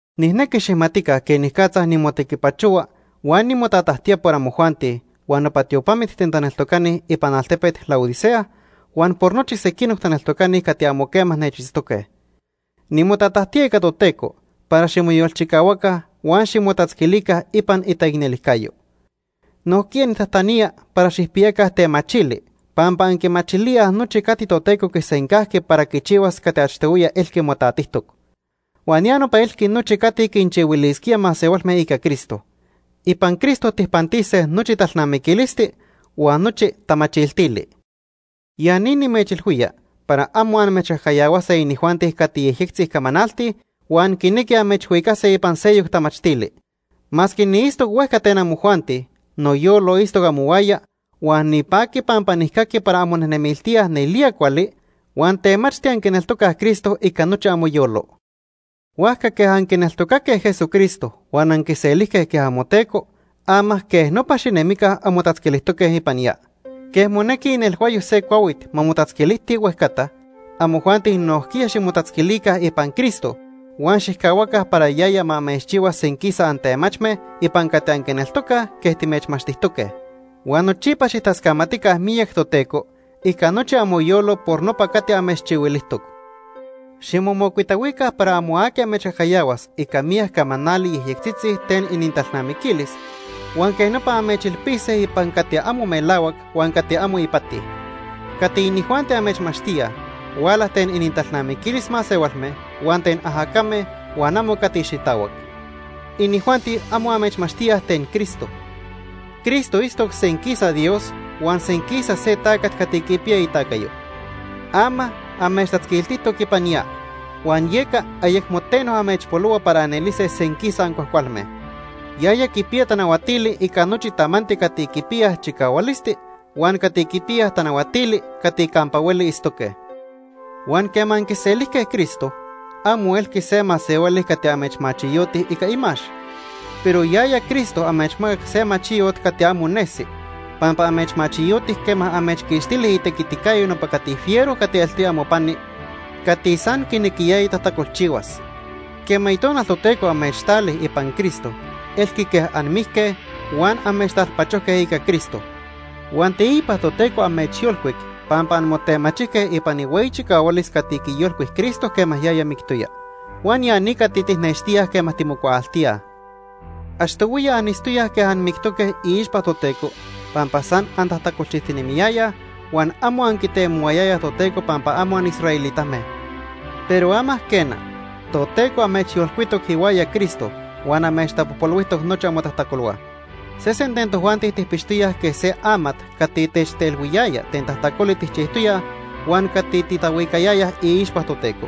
Nijnequi xijmatica quenicatza nimotequipachohua huan nimotajtatía por amojuanti huan nopa tiopamit ten taneltocani ipan altepet Laodicea huan por nochi sequinoc taneltocani cati amo quema nechitztoque. Nimotatajtía ica Toteco para ximoyolchicahuaca huan ximotatzquilica ipan itaicnelijcayo. Nojquiya nijtajtanía para xijpiyaca temachili pampa anquimachilíaj nochi cati Toteco quisencajqui para quichihuas cati achtohuiya elqui motatijtoc. Huan ya nopa elqui nochi cati quinchihuilisquía masehualme ica Cristo. Ipan Cristo tijpantise nochi talnamiquilisti huan nochi tamachiltili. Ya ni nimechilhuía para amo amechcajcayahuase inijuanti cati yejyectzi camanaltij huan quinequij amechhuicase ipan seyoc tamachtili. Masque niitztoc huejca ten amojuanti, noyolo itztoc amohuaya huan nipaqui pampa nijcaqui para anmonejnemiltíaj nelía cuali huan temachti anquineltocaj Cristo ica nochi amoyolo. Huajca quej anquineltocaque Jesucristo huan anquiselijque quej amoTeco, ama quej nopa xinemica anmotatzquilijtoque ipan ya. Quej monequi inelhuayo se cuahuit ma motatzquilijti huejcata, amojuanti nojquiya ximotatzquilica ipan Cristo huan xijcahuaca para yaya ma amechchihua senquisa antemachme ipan cati anquineltocaj quej timechmachtijtoque. Huan nochipa xijtascamatica miyac Toteco ica nochi amoyolo por nopa cati amechchihuilijtoc. Ximomocuitahuica para amo aqui amechcajcayahuas ica miyac camanali yejyectzitzi ten inintalnamiquilis huan quej nopa amechilpise ipan cati amo melahuac huan cati amo ipati. Cati inijuanti amechmachtíaj huala ten inintalnamiquilis masehualme huan ten ajacame huan amo cati xitahuac. Inijuanti amo amechmachtíaj ten Cristo. Cristo itztoc senquisa Dios huan senquisa se tacat cati quipiya itacayo. Ama amechtatzquiltijtoc ipan ya, huan yeca ayecmo teno amechpolohua para anelise senquisa ancuajcualme. Yaya quipiya tanahuatili ica nochi tamanti cati quipiyaj chicahualisti huan cati quipiyaj tanahuatili cati campa hueli itztoque. Huan quema anquiselijque Cristo, amo elqui se masehuali cati amechmachiyoti ica imax. Pero yaya Cristo amechmacac se machiyot cati amo nesi, pampa amechmachiyoti quema amechquixtili itequiticayo nopa cati fiero cati eltoya amopani cati san quinequiyaya tajtacolchihuas. Quema Itonal Toteco amechtali ipan Cristo, elqui quej anmijque huan amechtalpachojque ica Cristo. Huan teipa Toteco amechyolcuic pampa anmotemachijque ipan ihueyi chicahualis cati quiyolcuic Cristo quema yaya mictoya. Huan ya ni cati tijnextíaj quema timocuaaltíaj. Achtohuiya anitztoyaj quej anmictoque iixpa Toteco pampa san antajtacolchijtinemiyayaj huan amo anquitemohuayayaj Toteco pampa amo anisraelitame. Pero ama quena, Toteco amechyolcuitoc ihuaya Cristo huan amechtapojpolhuijtoc nochi amotajtacolhua. Sesen ten tojuanti tijpixtoyaj quej se amat cati techtelhuiyaya ten tajtacoli tijchijtoyaj huan cati titahuicayayaj iixpa Toteco.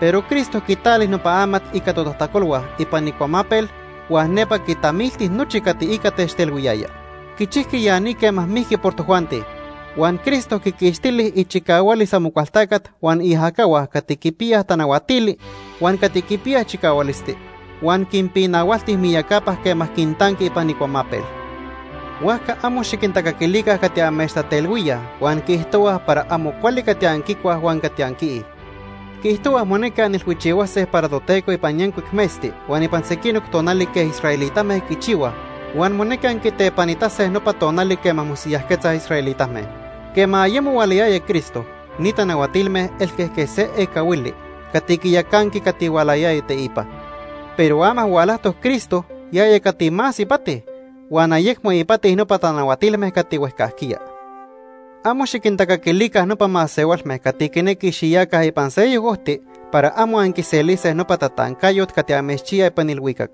Pero Cristo quitali nopa amat ica totajtacolhua ipan icuamapel huan nepa quitamilti nochi cati ica techtelhuiyaya. Quichijqui ya ni quema mijqui por tojuanti. Huan Cristo quiquixtili ichicahualis Amocualtacat huan iajacahua cati quipiyaj tanahuatili huan cati quipiyaj chicahualisti huan quinpinahualti miyacapa quema quintanqui ipan icuamapel. Huajca amo xiquintacaquilica cati amechtatelhuíaj huan quiijtohuaj para amo cuali cati anquicuaj huan cati anquiij. Quiijtohuaj monequi anilhuichihuase para Toteco ipan yancuic metzti huan ipan sequinoc tonali quej israelitame quichihuaj huan monequi anquitepanitase nopa tonali quema mosiyajquetzaj israelitame. Quema ayemo hualayaya Cristo, ni tanahuatilme elque quej se ecahuili cati quiyacanqui cati hualayaya teipa. Pero ama hualajtoc Cristo yaya cati más ipati, huan ayecmo ipati nopa tanahuatilme cati huejcajquiya. Amo xiquintacaquilica nopa masehualme cati quinequij xiyaca ipan seyoc ojti para amo anquiselise nopa tatancayot cati amechchiya ipan ilhuicac.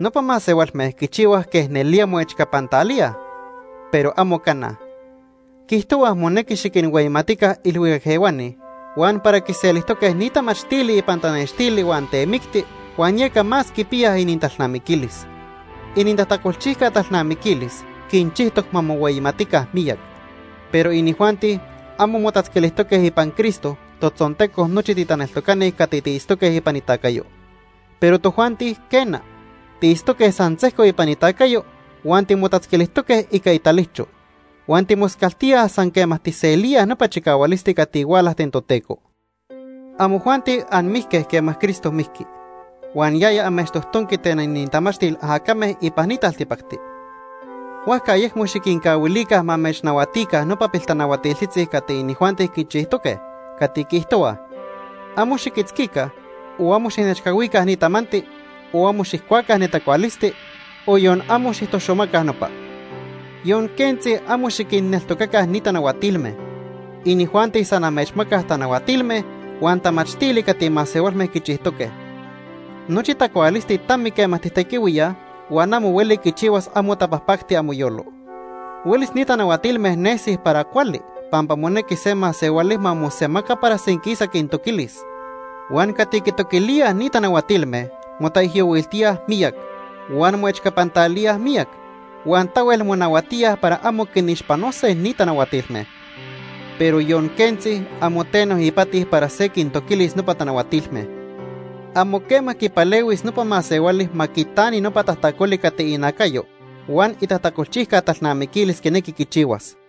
Nopa masehualme quichihuaj quej nelía moechcapantalíaj, pero amo cana. Quiijtohuaj monequi xiquinhueyimatica ilhuicac ehuani huan para quiselijtoque ni tamachtili ipan tanextili huan temicti huan yeca más quipiyaj inintalnamiquilis. Inintajtacolchijca talnamiquilis quinchijtoc ma mohueyimatica miyac. Pero inijuanti amo motatzquilijtoque ipan Cristo, totzonteco nochi titaneltocani cati tiitztoque ipan itacayo. Pero tojuanti, quena, tiitztoque san sejco ipan itacayo huan timotatzquilijtoque ica italijcho. Huan timoscaltíaj san quema tijselíaj nopa chicahualisti cati huala ten Toteco. Amojuanti anmijque quema Cristo mijqui, huan yaya amechtojtonqui ten inintamachtil ajacame ipan ni taltipacti. Huajca ayecmo xiquincahuilica ma amechnahuatica nopa piltanahuatiltzitzi cati inijuanti quichijtoque, cati quiijtohuaj: “Amo xiquitzquica o amo xijnechcahuica ni tamanti, o amo xijcuaca ne tacualisti, o yon amo xijtoxomaca nopa.” Yon quentzi amo xiquinneltocaca ni tanahuatilme. Inijuanti san amechmacaj tanahuatilme huan tamachtili cati masehualme quichijtoque. Nochi tacualisti tami quema tijtequihuíaj huan amo hueli quichihuas amo tapajpacti amoyolo. Huelis ni tanahuatilme nesij para cuali pampa monequi se masehuali ma mosemaca para senquisa quintoquilis. Huan cati quitoquilíaj ni tanahuatilme motaijyohuiltíaj miyac, huan moechcapantalíaj miyac, huan tahuel monahuatíaj para amo quinixpanose ni tanahuatilme. Pero yon quentzi, amo teno ipati para se quintoquilis nopa tanahuatilme. Amo quema quipalehuis nopa masehuali ma quitani nopa tajtacoli cati inacayo huan itajtacolchijca talnamiquilis quinequi quichihuas.